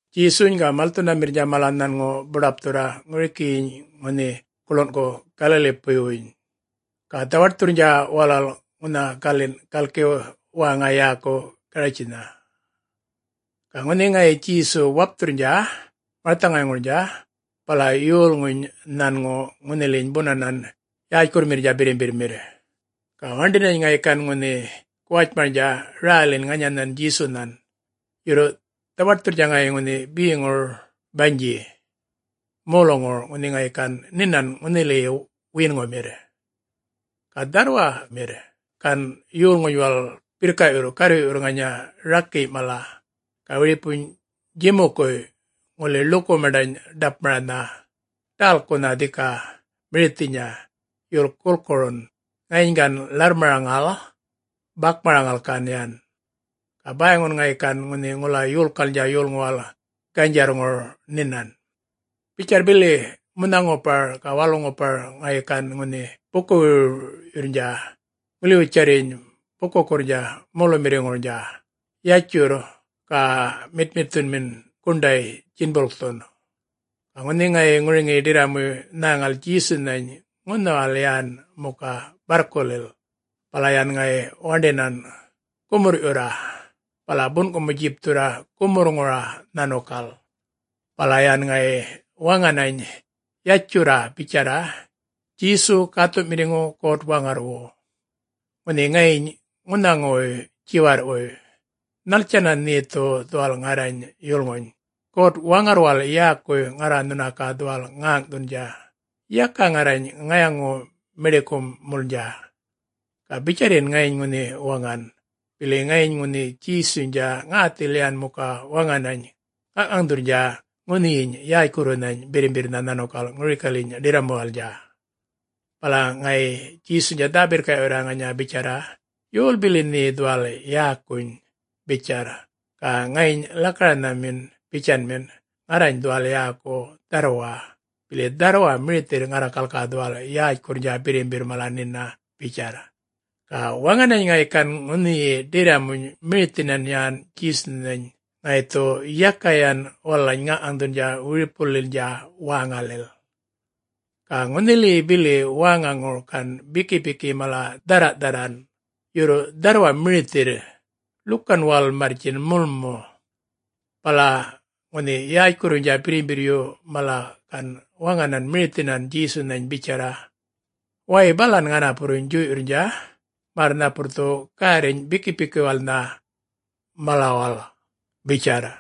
Djesuny ga malthunamirrnydja mala nhanŋu buḏapthurra ŋurikiyiny ŋunhi guḻungu Galalipuywuny, ga dhawaṯthurrnydja walal ŋunha galin' galki wäŋa yäku Garatjinnha. Ga ŋunhi ŋayi Djesu wapthurrnydja marthaŋayŋurnydja bala yolŋuny nhanŋu ŋunhiliyiny bunanan yätjkurrumirra birrimbirrmirr, ga waṉḏinany ŋayi gan ŋunhi guwatjmarnydja rälin ŋanyanhan Djesunhan, yurr dhawaṯthurrnydja ŋayi ŋunhi beŋuryi banydji moluŋur ŋunhi ŋayi gan nhinan ŋunhiliyi wiyinŋumirr. Ga dharrwamirr gan yolŋuy walal birrka'yurr garrwi'yurr ŋanya rakiy' mala, ga wiripuny djimukuy' ŋuli ḻuku maṉḏany ḏapmaranha ḏälkunha dhika mirithinya, yurr gulkurun, ŋayiny gan ḻarrmaraŋal bakmaraŋal gan yan. Ga bäyŋun ŋayi gan ŋunhi ŋula yolkalnydja yolŋuwal ganydjarrŋur nhinan. Bitjarr bili munha-ŋupar ga walu-ŋupar ŋayi gan ŋunhi buku-wirwiryurrnydja ŋulatjarryiny bukukurrnydja molumirrikurrnydja yatjurr, ga mitmitthunmin guṉḏay djinbulkthu. Ga ŋunhi ŋayi ŋuriŋiyi ḏirramuy nhäŋal Djesunhany ŋunhawal yan muka barrkulil, bala yan ŋayi waṉḏinan gumurr'yurra bala bun'kumu-djipthurra gumurrŋura nhanukal. Bala yan ŋayi waŋanany yatjurra bitjarra, “Djesu, Gäthu'mirriŋu God-Waŋarrwu, ŋunhi ŋayiny ŋunhaŋuwuy djiwarr'wuy, nhaltjanna nhe dhu dhuwal ŋarrany yulŋuny? God-Waŋarrwal yäkuy ŋarra nhuna ga dhuwal ŋäŋ'thundja, yaka ŋarrany ŋayaŋu-miḏikumulnydja.” Ga bitjarryiny ŋayi ŋunhi waŋan, bili ŋayiny ŋunhi Djesuynydja ŋäthil yan muka waŋanany ŋaŋ'ŋaŋ'thurrnydja ŋunhiyiny yätjkurrunhany birrimbirrnha nhanukal ŋurikalyiny ḏirramuwalnydja. Bala ŋayi Djesuynydja dhä-birrka'yurra ŋanya bitjarra, “Yol bili nhe dhuwal yäkuny?” bitjarr. Ga ŋayiny lakaranhamin bitjanmin, “Ŋarrany dhuwal yäku ‘Dharrwa,’ bili dharrwa mirithirr ŋarrakal ga dhuwal yätjkurrnydja birrimbirr mala nhina,” bitjarr. Ga waŋanany ŋayi gan ŋunhiyi ḏirramuny mirithinan yan Djesunhany ŋayi dhu yaka yan walalany ŋaŋ'ŋaŋ'thundja wiripulilnydja wäŋalil. Ga ŋunhiliyi bili bukuŋur gan bikipiki mala dhärra'-dharran, yurr dharrwa mirithirr, ḻukan walal marrtjin mulmu. Bala ŋunhi yätjkurruynydja birrimbirryu mala gan waŋanany mirithinan Djesunhany bitjarra, “Way balan ŋanapurruny djuy'yurrnydja, märr napurr dhu gärriny bikipikiwalnha malaŋuwal,” bitjarr.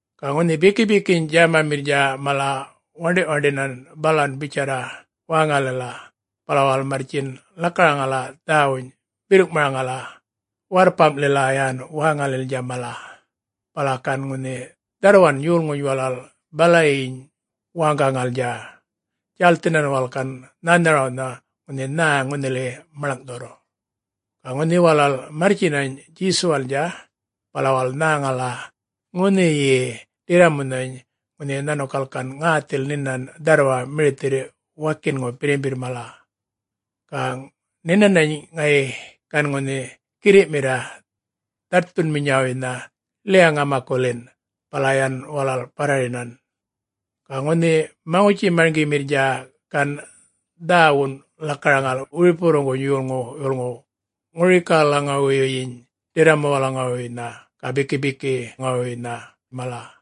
Ga ŋunhi bikipiki djämamirrnydja mala waṉḏi'-waṉḏinan balan bitjarra wäŋalila, bala walal marrtjin lakaraŋala dhäwuny birrŋ'maraŋala warrpam'lila yan wäŋalilnydja mala. Bala gan ŋunhi dharrwan yolŋuny walal balayin wäŋgaŋalnydja, djälthinan walal gan nhänharawnha ŋunhi nhä ŋunhiliyi maḻŋ'thurr. Ga ŋunhi walal marrtjinany Djesuwalnydja, bala walal nhäŋala ŋunhiyi ḏirramunhany ŋunhi nhanukal gan ŋäthil nhinan dharrwa mirithirr wakinŋu birrimbirr mala. Ga nhinanany ŋayi gan ŋunhi girri'mirra dhaṯthunawuynha ḻiya-ŋamakulin, bala yan walal barrarinan. Ga ŋunhi maŋutji-marŋgimirriynydja gan dhäwun lakaraŋal wiripuwurruŋguny yolŋu'-yulŋuw, ŋurikalaŋuwuyyin ḏirramuwalaŋuwuynha ga bikipikiwuynha mala.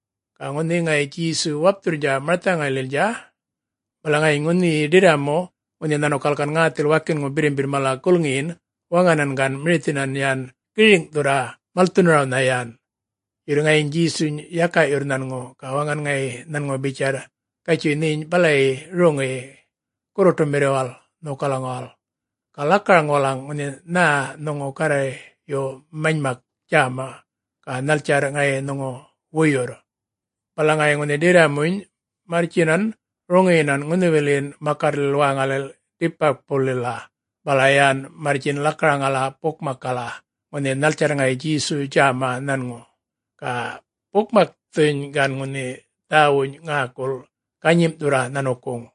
Ga ŋunhi ŋayi Djesu wapthurrnydja marthaŋaylilnydja, bala ŋayiny ŋunhiyiny ḏirramu ŋunhi nhanukal gan ŋäthil wakinŋu birrimbirr mala gulŋiyin, waŋanany gan mirithinan yan giriŋ'thurra malthunarawnha yan. Yurr ŋayiny Djesuny yaka'yurr nhanŋu, ga waŋan ŋayi nhanŋu bitjarr, “Gatjuy nheny balayi roŋiyi gurruṯumirriwal nhokalaŋuwal, ga lakaraŋ walalaŋgal ŋunhi nhä nhuŋu Garrayyu manymak djäma, ga nhaltjarr ŋayi nhuŋu wuyurr.” Bala ŋayi ŋunhi ḏirramuny marrtjinan roŋiyinan ŋunhiwilin makarrlil wäŋalil Dikapulitjlila, bala yan marrtjin lakaraŋala bukmakkala, ŋunhi nhaltjarr ŋayi Djesuy djäma nhanŋu. Ga bukmakthuny gan ŋunhi dhäwuny ŋäkul ganyim'thurra nhanukuŋ.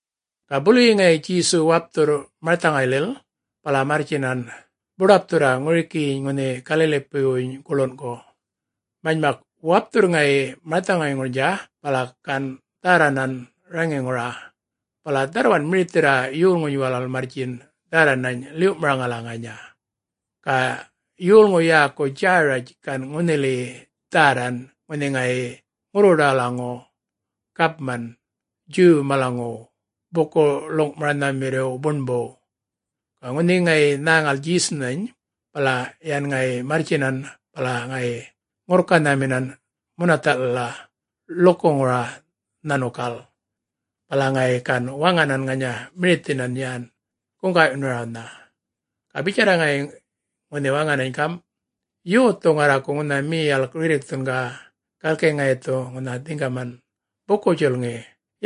Ga buluyi ŋayi Djesu wapthurr marthaŋaylil, bala marrtjinan buḏapthurra ŋurikiyiny ŋunhi Galalipuywuny guḻungu. Manymak wapthurr ŋayi marthaŋayŋurnydja bala gan dhärranan raŋiŋura, bala dharrwan mirithirra yolŋuny walal marrtjin dhärranany ḻiw'maraŋala ŋanya. Ga yolŋu yäku Djäratj gan ŋunhiliyi dhärran ŋunhi ŋayi ŋurruḏawalaŋu gapman Djuw malaŋuw buku-ḻuŋ'maranhamirriw buṉbuw. Ga ŋunhi ŋayi nhäŋal Djesunhany, bala yan ŋayi marrtjinan bala ŋayi ŋurrkanhaminan munatha'lila ḻukuŋura nhanukal. Bala ŋayi gan waŋanan ŋanya mirithinan yan guŋga'yunarawnha. Ga bitjarr ŋayi ŋunhi waŋanany gam', “Yothu ŋarraku ŋunha miyalk rirrikthun ga, galki ŋayi dhu ŋunha dhiŋgaman! Buku-djulŋi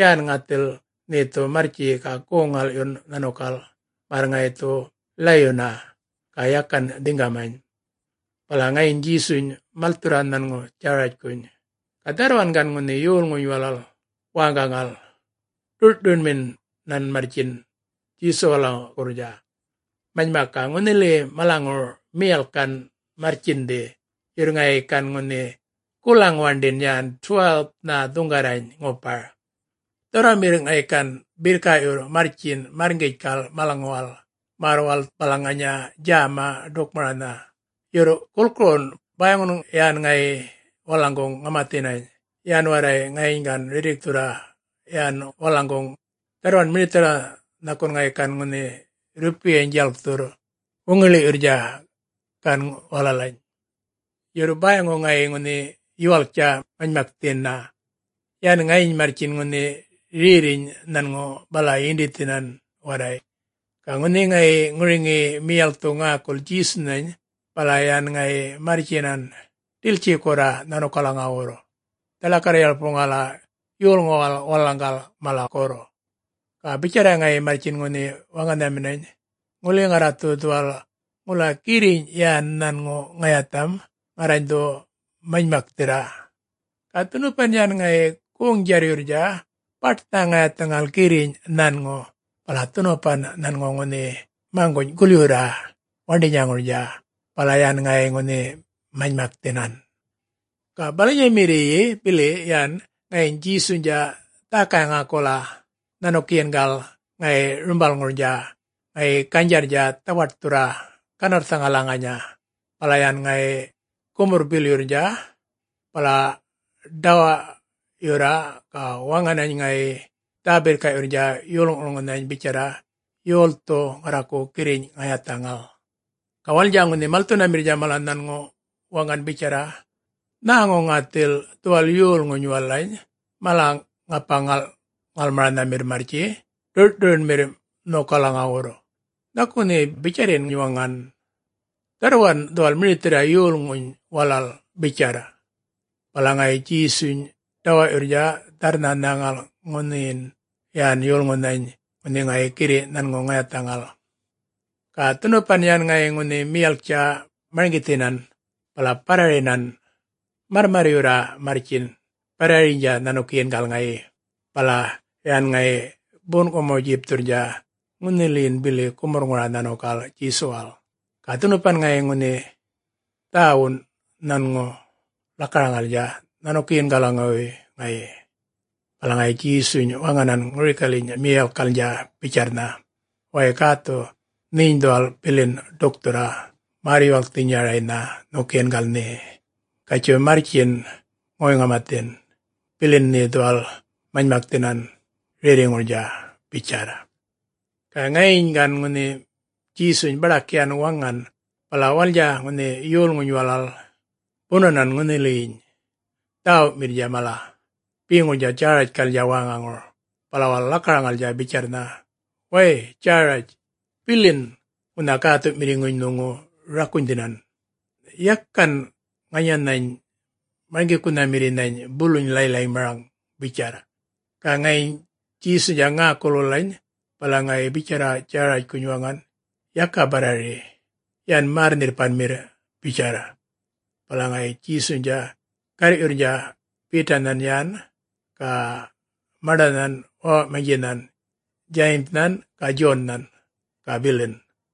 yan ŋathil nhe dhu marrtji ga goŋ-ŋal'yun nhanukal märr ŋayi dhu ḻayyunna, ga yakan dhiŋgamany.” Bala ŋayiny Djesuny malthurra nhanŋu Djäratjkuny. Ga dharrwan gan ŋunhi yolŋuny walal wäŋgaŋal ḏur'-ḏuryunminan marrtjin Djesuwalaŋuwurra. Manymak ga ŋunhiliyi malaŋur miyalk gan marrtjindhi, yurr ŋayi gan ŋunhi gulaŋ waṉḏin yan 12-nha dhuŋgarrany ŋupar. Dharrwamirr ŋayi gan birrka'yurr marrtjin marrŋgitjkal malaŋuwal, märr walal balaŋ ŋanya djäma ḏukmaranha, yurr gulkurun, bäyŋu yan ŋayi walalaŋguŋ ŋamathinany, yan warray ŋayiny gan rirrikthurra yan walalaŋguŋ. Dharrwan mirithirra nhakun ŋayi gan ŋunhi rrupiyany djalkthurr wuŋiḻi'yurrnydja gan walalany. Yurr bäyŋu ŋayi ŋunhi yuwalktja manymakthina. Yan ŋayiny marrtjin ŋunhi rerriny nhanŋu bala yindithin warray. Ga ŋunhi ŋayi ŋuriŋiyi miyalkthu ŋäkul Djesunhany, bala yan ŋayi marrtjinany ḏiltjikurra nhanukalaŋuwurr, dhaḻakarr-yarpuŋal yolŋuwal walalaŋgal malakurr. Ga bitjarr ŋayi marrtjin ŋunhi waŋanhaminany, “Ŋuli ŋarra dhu dhuwal ŋula girriny' yan nhanŋu ŋayatham, ŋarrany dhu manymakthirra.” Ga dhunupan yan ŋayi goŋ-djarryurrnydja baṯnha ŋayathaŋal girrin' nhanŋu, bala dhunupan nhanŋu ŋunhi maŋguny' gulyurra waṉḏinyaŋurnydja, bala yan ŋayi ŋunhi manymakthinan. Ga balanyamirriy bili yan ŋayiny Djesuynydja dhäkay-ŋäkula nhanukiyingal ŋayi rumbalŋurnydja ŋayi ganydjarrnydja dhawaṯthurra ganarrthaŋala ŋanya. Bala yan ŋayi gumurr-bilyurrnydja, bala ḏawa'yurra ga waŋanany ŋayi dhä-birrka'yurrnydja yolŋu'-yulŋunhany bitjarra, “Yolthu ŋarraku girriny ŋayathaŋal?” Ga walalnydja ŋunhi malthunamirrnydja mala nhanŋu waŋan bitjarra, “Nhäŋu ŋathil dhuwal yolŋuny walalany mala ŋapa-ŋal'-ŋalmaranhamirr marrtji ḏur'-ḏuryunmirr nhokalaŋuwurr, nhaku nhe bitjarryiny waŋan, dharrwan dhuwal mirithirra yolŋuny walal,” bitjarr. Bala ŋayi Djesuny ḏawa'yurrnydja dharrnha nhäŋal ŋunhiyin yan yolŋunhany ŋunhi ŋayi girri' nhanŋu ŋayathaŋal. Ga dhunupan yan ŋayi ŋunhi miyalktja marŋgithinan bala barrarinan, marrmarryurra marrtjin barrariynydja nhanukiyingal ŋayi, bala yan ŋayi bun'kumu djipthurrnydja ŋunhilin bili gumurrŋura nhanukal Djesuwal, ga dhunupan ŋayi ŋunhi dhäwun nhanŋu lakaraŋalnydja nhanukiyingalaŋuwuy ŋayi. Bala ŋayi Djesuny waŋanan ŋurikalyiny miyalkkalnydja bitjarrnha, “Way gäthu, nheny dhuwal bilin ḏukthurra märr-yuwalkthinyaraynha nhokiyingal nhe. Gatjuy marrtjiny ŋoy-ŋamathin, bilin nhe dhuwal manymakthinan rerriŋurnydja,” bitjarr. Ga ŋayiny gan ŋunhi Djesuny baḏak yan waŋan, bala walalnydja ŋunhi yolŋuny walal bunanan ŋunhiliyiny dhäwumirrnydja mala beŋurnydja Djäratjkalnydja wäŋaŋur, bala walal lakaraŋalnydja bitjarrnha, “Way Djäratj, bilin ŋunha gäthu'mirriŋuny nhuŋu rakunydhinan. Yakan ŋanyanhany Marŋgikunhamirrinhany buluny ḻay-ḻaymaraŋ,” bitjarr. Ga ŋayiny Djesuynydja ŋäkul walalany, bala ŋayi bitjarra Djäratjkuny waŋan, “Yaka barrari, yan märr-nhirrpanmirra,” bitjarr. Bala ŋayi Djesuynydja garr'yurrnydja Betanhan yan, ga maṉḏanhan wäwa'manydjinhan Djayimnhan ga Djonnhan, ga bilin.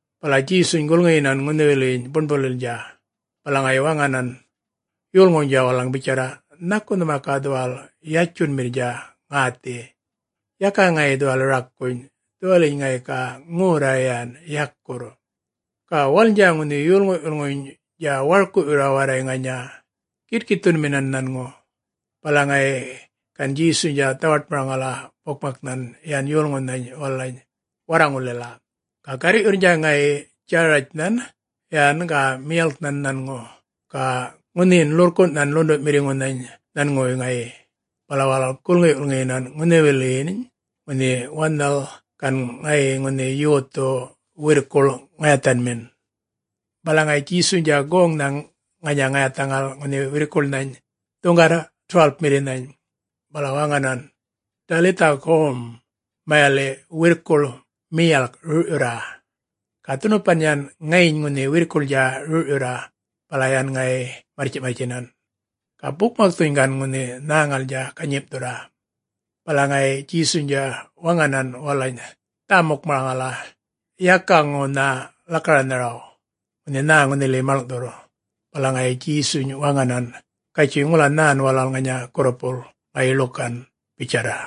Bala Djesuny gulŋiyinan ŋunhiwiliyiny buṉbulilnydja, bala ŋayi waŋanan yolŋuwnydja walalaŋ bitjarra, “Nhaku nhuma ga dhuwal yatjunmirrnydja ŋäthi? Yaka ŋayi dhuwal rakuny, dhuwaliyiny ŋayi ga ŋorra yan yakurr.” Ga walalnydja ŋunhi yolŋu'-yulŋuynydja warku'yurr warray ŋanya gitkitthunmin nhanŋu. Bala ŋayi gan Djesuynydja dhawaṯmaraŋala bukmaknhan yan yolŋunhany walalany warraŋullila, ga garr'yurrnydja ŋayi Djäratjnhan yan ga miyalknhan nhanŋu, ga ŋunhiyin ḻurrkun'nhan ḻundu'mirriŋunhan nhanŋuwuy ŋayi, bala walal gulŋi'-gulŋiyinan ŋunhiwiliyin ŋunhi wanhal gan ŋayi ŋunhi yothu wirrkuḻ ŋayathanhamin. Bala ŋayi Djesuynydja goŋnha ŋanya ŋayathaŋal ŋunhi wirrkuḻnhany dhuŋgarra 12-mirrinhany, bala waŋanan, “Dalitha gom,” mayali' “Wirrkuḻ miyalk rur'yurra.” Ga dhunupan yan ŋayiny ŋunhi wirrkuḻnydja rur'yurra, bala yan ŋayi marrtji'-marrtjinan. Ga bukmakthuny gan ŋunhi nhäŋalnydja ganyim'thurra. Bala ŋayi Djesuynydja waŋanan walalany dhä-mukmaraŋala yakaŋuwnha lakaranharaw, ŋunhi nhä ŋunhiliyi maḻŋ'thurr. Bala ŋayi Djesuny waŋanan, “Gatjuy ŋula nhä walal ŋanya gurrupul ŋayi ḻukan,” bitjarr.